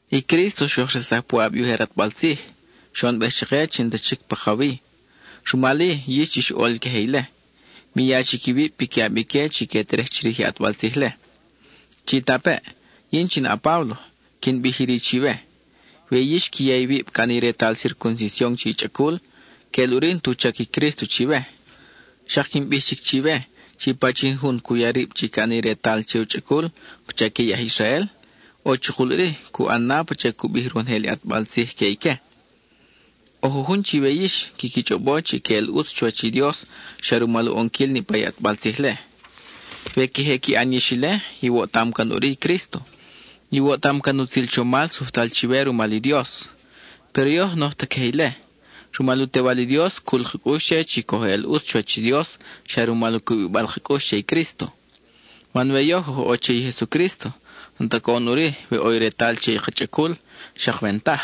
I Crísto xoj resaj puʼab i ujer ʼatbal tzij, xoʼonbej chake chi n-ta chic pakawi; rumal-i yix chix ʼol queje ile, mi ya chic iwib piquiʼab ique chi que terej chirij i ʼatbal tzij-le. Chitapeʼ. Yin in a-Páblo quin bij iri chiwe: we yix qui ya iwib ca ʼani i retal circuncision che i chʼacul, queʼel ʼuri n-tu chac i Crísto chiwe. Xak quin bij chic chiwe chi pachin jun cu ya rib chi ca ʼani i retal che u chʼacul pacha que i aj Israel, ʼo chukul ʼuri cu ʼan na pacha i cu bij ronojel i ʼatbal tzij que ique. ʼO jujun chiwe yix quiqui chʼobo chi que eʼel ʼutz chuwach i Dios xa rumal u ʼonquil niʼpa i ʼatbal tzij-le. We queje qui ʼan yix ile, iwoʼtam can ʼuri i Crísto; iwoʼtam can i utzil chomal sujtal chiwe rumal i Dios. Péro yoj n-oj ta queje ile. Rumal u Tewal i Dios, cul ka cʼux che chi coj eʼel ʼutz chuwach i Dios xa rumal u cubibal ka cʼux che i Crísto. Man we yoj oj ʼo che i Jesucrísto, n-ta coʼon ʼuri we ʼo i retal che i ka chʼacul, xak we n-taj.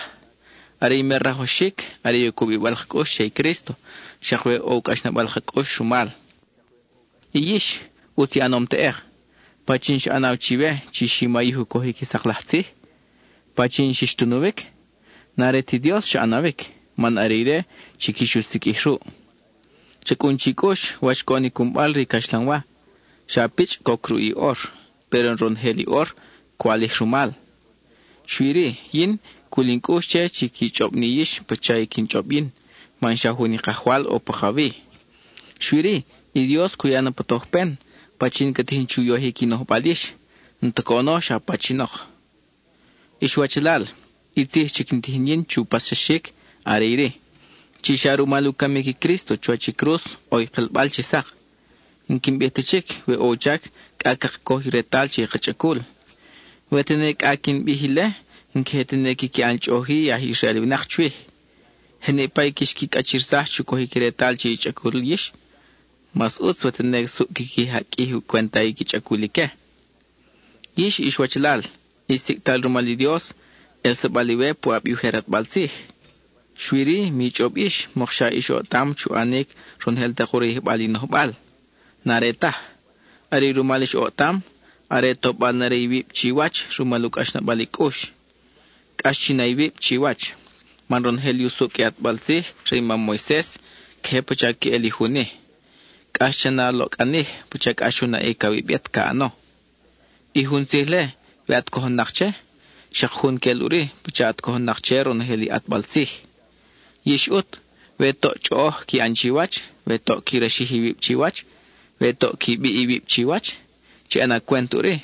Are i mer rajwaxic, are i u cubibal ka cʼux che i Crísto, xak we ʼo u cʼaxnabal ka cʼux rumal. I yix, ʼutz i ʼanom teʼek. ¿Pachin xa ʼanaw chiwe chi xi mayij u cojic i sak laj tzij? ¿Pachin xix tunuwic? N-are ti Dios xa ʼanawic, man are ire chi quix u siqʼuij ruʼ. Cha cʼun chi cʼux wach coʼon i cunbal re i caxlanwa: xa pichʼ coc ruʼ i ʼor, péro ronojel i ʼor ca walij rumal. Xui-ri yin, cul in cʼux che chi qui chʼob ni yix pacha i quin chʼob yin man xa jun i Kajwal ʼo pakawi. Xui-ri, i Dios cu ya na pa tojpen pachin ca tijin chu yojic i nojbal yix, n-ta coʼono xa pachinok. Ix wachalal, i tzij chi quin tijin yin chu paxsaxic, are iri: chi xa rumal u camic i Crísto chuwach i cruz ʼo i kelbal chi sak. N-quin bij ta chic we ʼo u chac cʼa caka coj i retal che i ka chʼacul. We tene cʼa quin bij ile, n-queje tene quiqui ʼan chʼoʼoj-i i aj Israel winak chwij. Je niʼpa i quix qui cʼachirsaj chu cojic i retal che i chʼacul yix, mas ʼutz we tene suʼ quiqui jaqʼuij i u cwenta i qui chʼacul ique. Yix ix wachalal, ix sicʼtal rumal i Dios, ʼelsabal iwe puʼab i ujer ʼatbal tzij. Xui-ri mi chʼob yix mokxa ix oʼtam chu ʼanic ronojel tak u rayijbal i nojbal; n-are taj. Are i rumal ix oʼtam, are tobal na re iwib chiwach rumal u cʼaxnabal i cʼux. Cʼax chi na iwib chiwach, man ronojel i usucʼ i ʼatbal tzij re i mam Moises queje pacha queʼel i jun-i: “Cʼax cha na a loʼcʼanij pacha cʼax u naʼic awib yet ca ʼano.” I jun tzij-le, we at cojon-nak che, xak jun queʼel ʼuri pacha at cojon-nak che ronojel i ʼatbal tzij. Yix ʼut, we toʼ chʼoʼoj qui ʼan chiwach, we toʼ qui raxij iwib chiwach, we toʼ qui biʼ iwib chiwach, chi ʼana cwent ʼuri,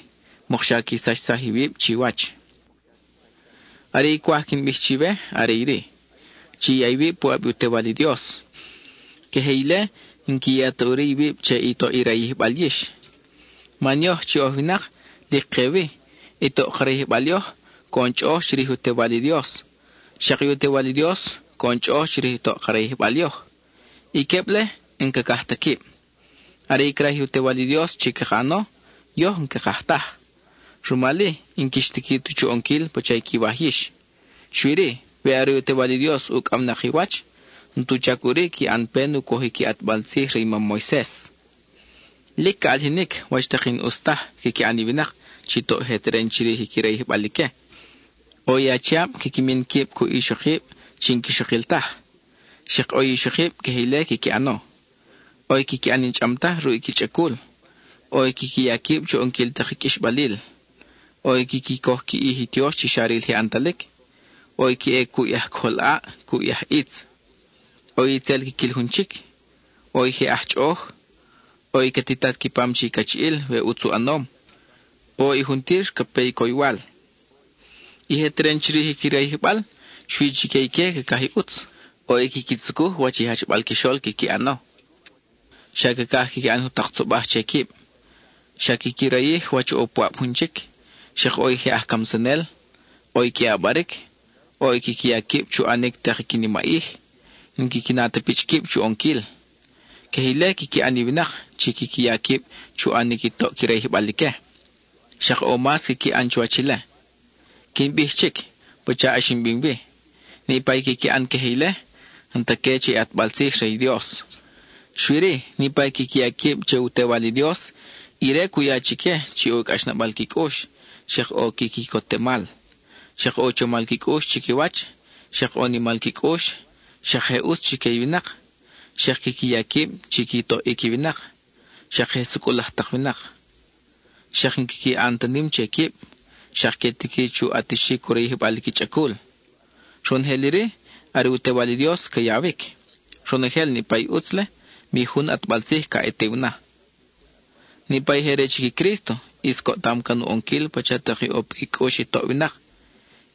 mokxa qui sachsaj iwib chiwach. Are i cwaj quin bij chiwe are iri: chi ya iwib puʼab i u Tewal i Dios; queje ile n-qui ya ta ʼuri iwib che i toʼ i rayijbal yix. Man yoj chi oj winak, lic ke wi, i toʼ ka rayijbal yoj coʼon chʼoʼoj chirij i u Tewal i Dios. Xak i u Tewal i Dios coʼon chʼoʼoj chirij i toʼ ka rayijbal yoj. I queb-le n-cacaj ta quib; are i craj i u Tewal i Dios chi caka ʼano, yoj n-cakaj taj. Rumal-i n-quix tiqui ta chu ʼonquil pacha i quiwaj yix. Xui-ri, we are i u Tewal i Dios ucʼawnak i wach, n-tu chac ʼuri qui ʼan pen u cojic i ʼatbal tzij re i mam Moises. Lic ca ʼalijinic wach tak i n-ʼus taj quiqui ʼan i winak chi toʼ je teren chirij i qui rayijbal ique: ʼo i achiab quiqui min quib cuʼ ixokib chi n-quixokil taj, xak ʼo i ixokib queje ile quiqui ʼano; ʼo i quiqui ʼan i n-chʼam taj ruʼ i qui chʼacul; ʼo i quiqui ya quib chu ʼonquil tak i qʼuixbalil; ʼo i quiqui coj qui ʼij i tiox chi xa ril je ʼantalic; ʼo i que ʼe cuʼ i aj cojol ʼaʼ, cuʼ i aj ʼitz; ʼo i tzel quiquil jun chic; ʼo i je aj chʼoʼoj; ʼo i ca titat qui pam che i cachiʼil we ʼutz u ʼanom; ʼo i juntir ca pe coywal. I je teren chirij i qui rayijbal, xui chique ique cacaj i ʼutz; ʼo i quiqui tzucuj wach i jachbal quixol quiqui ʼano; xa cacaj quiqui ʼan jutak tzobaj che quib. Xa quiqui rayij wach ʼo puʼab jun chic; xak ʼo i je aj camsanel; ʼo i que ʼabaric; ʼo i quiqui ya quib chu ʼanic tak qui nimaʼij, n-quiqui na ta pichʼ quib chu ʼonquil. Queje ile quiqui ʼan i winak chi quiqui ya quib chu ʼanic i toʼ qui rayijbal ique, xak ʼo mas quiqui ʼan chuwach ile. Quin bij chic pacha ʼax in bim wi: niʼpa i quiqui ʼan queje ile, n-ta que che i ʼatbal tzij re i Dios. Xui-ri, niʼpa i quiqui ya quib che u Tewal i Dios, ire cu ya chique chi ʼo u cʼaxnabal qui cʼux, xak ʼo qui quicotemal, xak ʼo u chomal qui cʼux chiquiwach, xak ʼo u nimal qui cʼux, xak je ʼutz chique i winak, xak quiqui ya quib chi qui toʼic i winak, xak je sucʼul laj tak winak, xak n-quiqui ʼan ta nim che quib, xak que tiqui chu ʼatixic u rayijbal qui chʼacul. Ronojel iri, are u Tewal i Dios ca yawic. Ronojel niʼpa i ʼutz-le, mi jun ʼatbal tzij ca ʼatiw na. Niʼpa i je re chic i Crísto, ʼis coʼtam can u ʼonquil pacha tak i ʼo piqui cʼux i toʼ winak;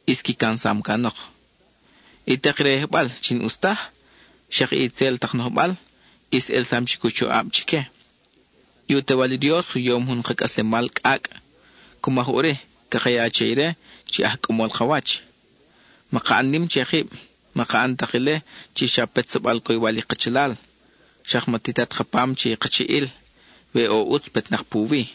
ʼis qui camsam canok. I tak rayijbal chi n-ʼus taj, xak i itzel tak nojbal, ʼis ʼelsam chic u choʼab chique. I u Tewal i Dios u yom jun ka cʼaslemal cʼacʼ; cu maj ʼuri caka ya che ire chi aj cʼamol ka wach. Maka ʼan nim che kib; maka ʼan tak ile chi xa petsabal coywal i kachalal; xak ma titat ka pam che i kachiʼil we ʼo ʼutz petnak puwi.